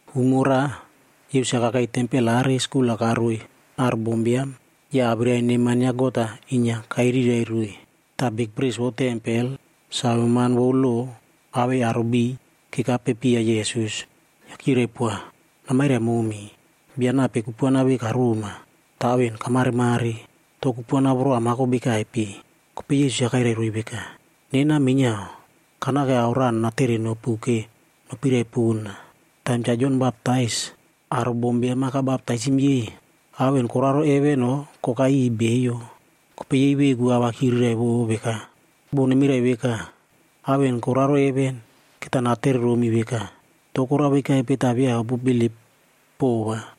Umo raꞌa, Yesus-a kakei tempel aꞌari skul-a karoiy aro bombiam ya awirai neman ya God-a inyia kairirai roiy. Ta bikpris vou tempel, saveman vou lo awei aro beiy kekapepiya Yesus. Ya kyirai poa, “Namairai momi, bia nape kupuana ve karoma, ta ao en kamaremare? To kupuana voro amako bekaipe?” Kopei Yesus-a kairai roiy veka, “Nena minyiao, kanake ao raꞌa nanatere nopu ke nopiraipona. Taim Cha Jon Baptais, aro bombiam-a kabaptaisim yei, ao en koraro heven o kokai iꞌiy beiyo?” Kopei yei veku a va kyiriraivo veka, “Bo nemirai veka, ‘Ao en koraro heven,’ keta natere romi veka, ‘To korao vekaipe ta via opubilip pova?’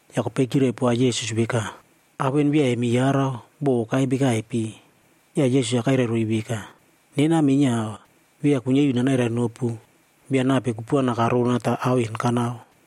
Ya kopei kyirai poa Yesus veka, “Ao en via emi yarau bo okai bekaipe.” Ya Yesus-a kairai roiy veka, “Nena minyiao, via kuinyia iu nanairai nopu, bia nape kupuana karona ta ao en kanao.”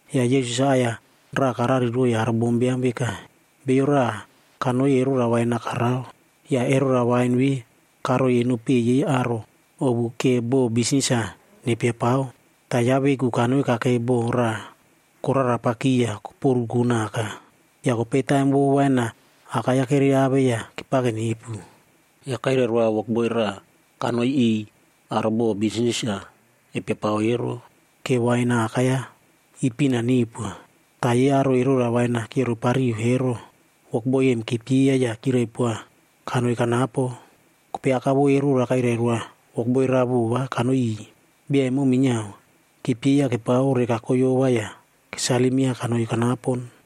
Ya Yesus-a aꞌai-ya raꞌa karariroiy aro bombiam veka, “Beiyo raꞌa kanoi erora wain-a karao. Ya erora wain ve karoiy eno peꞌe yei aro ovu ke bo bisnis-a nepiapao. Ta yaꞌa veku kanoi kakei boko raꞌa korarapaki ya koporuko naka. Ya kopei taim vou wain-a akai-ya kereave ya kepake nepu, ya kairai roa wokboi raꞌa kanoi iꞌiy aro bo bisnis-a epiapao ero, ke wain akai-ya ipin-a neupoa. Ta yei aro erora wain-a kyiorepariu ero, wokboi em kepyeiya ya kyirai poa kanoi kanapo. Kopei aka vou erora kairai roa wokboi raꞌa vova kanoi iꞌiy. Bia emo minyiao, kepyeiya kepao reka koyova ya kesalim yaꞌa kanoi kanapon.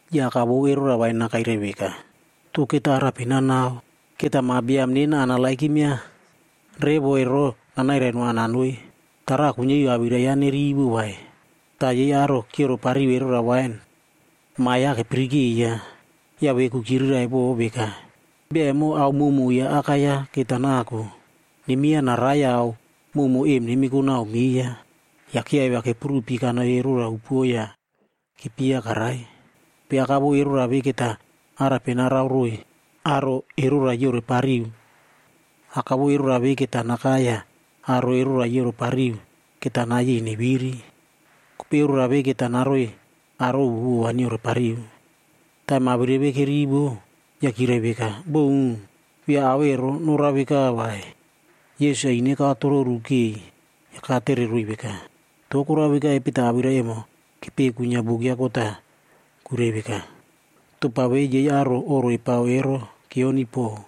“Ya aka vou erora wain-a kairai veka, ‘To keta arape nanao? Keta ma biam nena kanerenova revo ero nanairai noa nanoi. Tara kuinyia iu awirai yaꞌa nerivo vai.’ “Ta yei aro kyiorepariu erora wain, ma yaꞌa kepirikeiya, ya veku kyiriraivo veka, ‘Bia emo ao mowmow ya aka yaꞌa keta nako. Nemyeiya narai ya ao mowmow em nemiko nau meiya.’ Ya kyiaivia kepurupi kanoi erora upuo ya kepyeiya karai. Kopei aka vou erora ve keta arape narao roiy aro erora yiorepariu? Aka vou erora ve keta nakai ya aro erora yiorepariu keta nayei neviri. Kopei erora ve keta naroiy aro ovu vova nyiorepariu.” Taim awirai ve kerivo, ya kyirai veka, “Boun! Via ao ero norao veka vai.” Yesus-a ine katororu kei ya katereroiy veka, “To korao vekaipe ta awirai emo kepeꞌe kuinyia buk ya God-a kuirai veka, ‘Topa ve yei aro oꞌro epao ero kyioniy pow,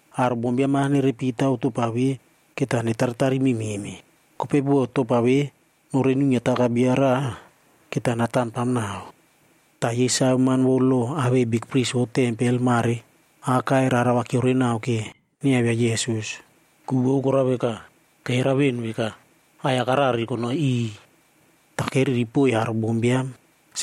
Aro bombiam-a nerepi taw topa ve, keta netaritari mememe. Kopei bo topa ve norei nuinyia taka bia raꞌa, keta natamtam nau.” Ta yei saveman vou lo awei bikpris vou tempel mare akai rara va kyiorenao ke nyiaivia Yesus. Ku vou korao veka, keyarau ven veka, aꞌai-ya karari konoi iꞌiy. Ta keriri poiy aro bombiam.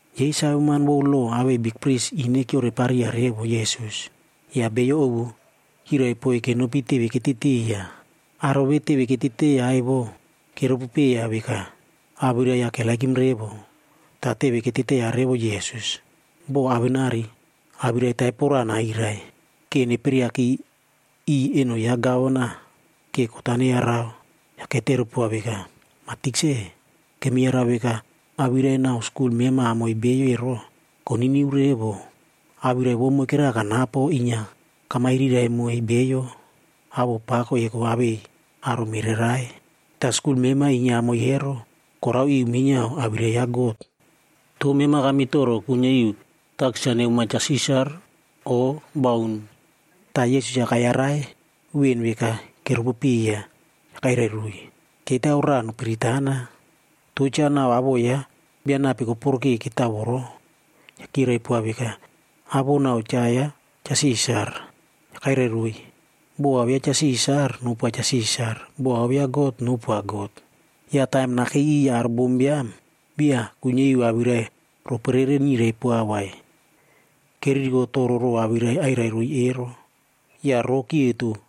Yei saveman vou lo awei bikpris ine kyiorepariya revo Yesus. Ya beiyo ovu kyiraipoiy kenopi teve keteteiya. Aro ve teve keteteiya evo, keropopeiya veka, awirai yaꞌa keperepow revo. Ta teve keteteiya revo Yesus, bo awenari awirai taipo raꞌa nairai, ke neperiaki iꞌiy eno ya gavana ke kot-a neyarao. Ya ketere poa veka, “Ma Tikse, kemi yarau veka awirai nau skul mema amoiy beiyo ero, koniniu revo. Awirai vou moikera kanapo inyia kamairirai moiy beiyo awoꞌo pako eko awei aro mererai. Ta skul mema inyia amoiy ero, korao iu minyiao awirai ya God. To mema kamitoro kuinyia iu takis-a nemoa Cha Sisar o baun?” Ta Yesus-a kayarai ven veka keropopeiya, ya kairai roiy, “Ketao raꞌa nopiritana. To cha nau awoꞌo ya bia nape koporokeo ketao voro?” Ya kyirai poa veka, “Awoꞌo nau cha ya Cha Sisar.” Ya kairai roiy, “Bo ao ya Cha Sisar, nopoa Cha Sisar. Bo ao ya God, nopoa God.” Ya taim nakei iꞌiy aro bombiam, via kuinyia iu awirai roporere nyirai poa vai. Keririko toro row awirai airairoiy ero, ya roꞌo kyeto.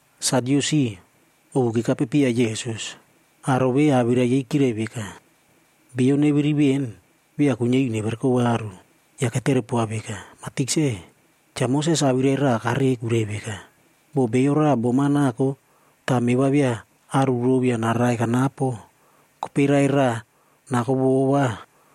Sadyusib ovu kekapepiya Yesus. Aro ve awirai yei kyirai veka, beiyo neviri ven, via kuinyia iu nevereko varu. Ya ketere poa veka, “Ma Tikse, Cha Moses awirai raꞌa kareꞌe kuirai veka, ‘Bo bia raꞌa bom-a nako ta meꞌe va via aru row ya narai kanapo, kopei raꞌai raꞌa nako vova,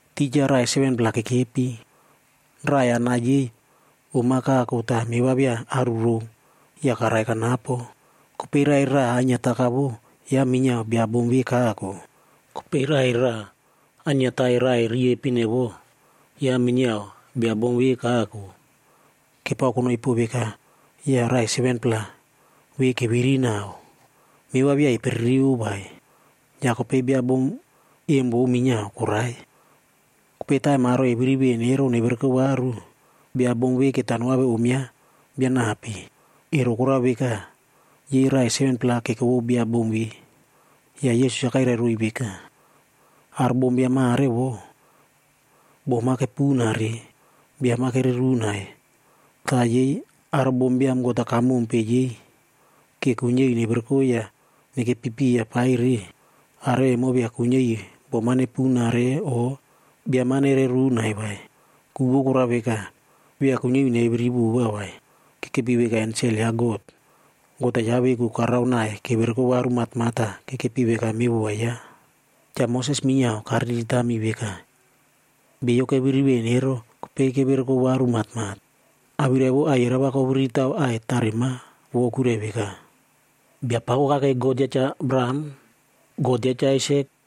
Tija raꞌai 7-pla kekepi. Raꞌai anai yei om-a kako ta meꞌe va via aru row ya karai kanapo. Kopei raꞌai raꞌa ainyia takavo, yaꞌa minyiao bia bom ve kako. Kopei raꞌai raꞌa ainyia tai raꞌai riepin evo, yaꞌa minyiao bia bom ve kako. Kepao konoi po veka ya raꞌai 7-pla ve keviri nau. Meꞌe va via eperereiyo vai. Ya kopei bia bom em vou minyiao korai. Kopei taim aro eviri ven ero nevereko varu, bia bom ve keta noave om yaꞌa bia nape?” Ero korao veka, yei raꞌai 7-pla keko vou bia bom ve. Ya Yesus-a kairai roiy veka, “Aro bombiam mare vo, bom-a kepunare, biam-a kererunai. Ta yei aro bombiam God-a kamompe yei ke kuinyia iu nevereko ya nekepi piya paire, aro emo via kuinyia iu bom-a nepunare o biam-a nererunai vai. Ku vou korao veka, via kuinyia iu neviri vova vai. Kekepi veka ensel ya God. God-a yaꞌa veku karaonai kevereko varu matmat ta kekepi veka mevova yaꞌa. Cha Moses minyiao kariritami veka, beiyo keviri ven ero kopei kevereko varu matmat. Awirai vou aiyerao va koviriri taw aꞌai tarema vo kuirai veka, ‘Biapako kakei God ya Cha Abraham, God ya Cha Aisak,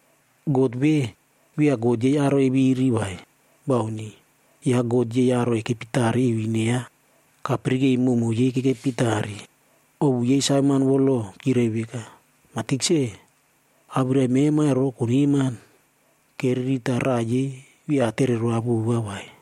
God ve, via God yei aro eviri vai, bauni. Yaꞌa God yei aro ekepi tare iu ine yaꞌa, kapirikei mowmow yei kekepi tare.” Ovu yei saveman vou lo kyirai veka, “Ma Tikse, awirai mema ro koneman.” Keriri ta raꞌa yei via atere roa vova vai.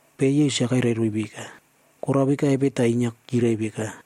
Kopei Yesus-a karai roiy veka, “Korao vekaipe ta inyia kyirai veka,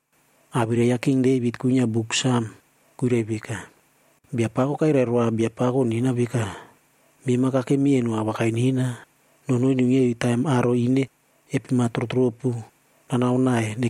Awirai ya King Devit kuinyia Buk Sam kuirai veka, ‘Biapako kairai roa Biapako nena veka, “Mema kakemi eno awakai nena, nonoi nuinyia iu taim aro ine epema trotropu nanao nai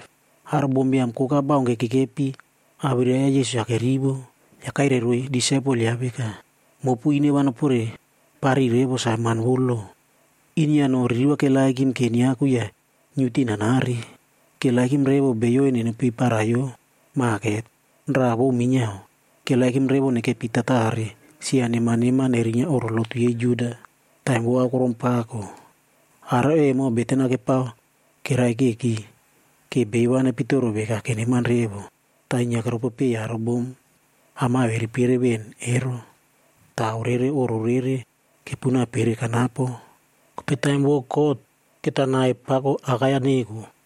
Aro bombiam koka baunke kekepi awirai yaꞌa Yesus-a kerivo, ya kairai roiy disaipel yaꞌa veka, “Mopu ine va noporepariy revo saveman vou lo. Inyia no ririvag keperepow revo nyiaku ya nyiute nanare. Keperepow revo beiyo eno nepei paraiyo maket. Raꞌa vou minyiao, keperepow revo nekepi tatare sia neman neman erinyia oꞌro lotu yei Juda, taim vou aokorom pako. Aro emo beten-a kepao keraikeki ke beiyo va nepitoro veka keneman revo. Ta inyia keropopei aro bom am-a eviripere ven ero, ta ao rere oꞌro rere kepuna pere kanapo. Kopei taim vou kot, keta nai pako akai-ya neko.”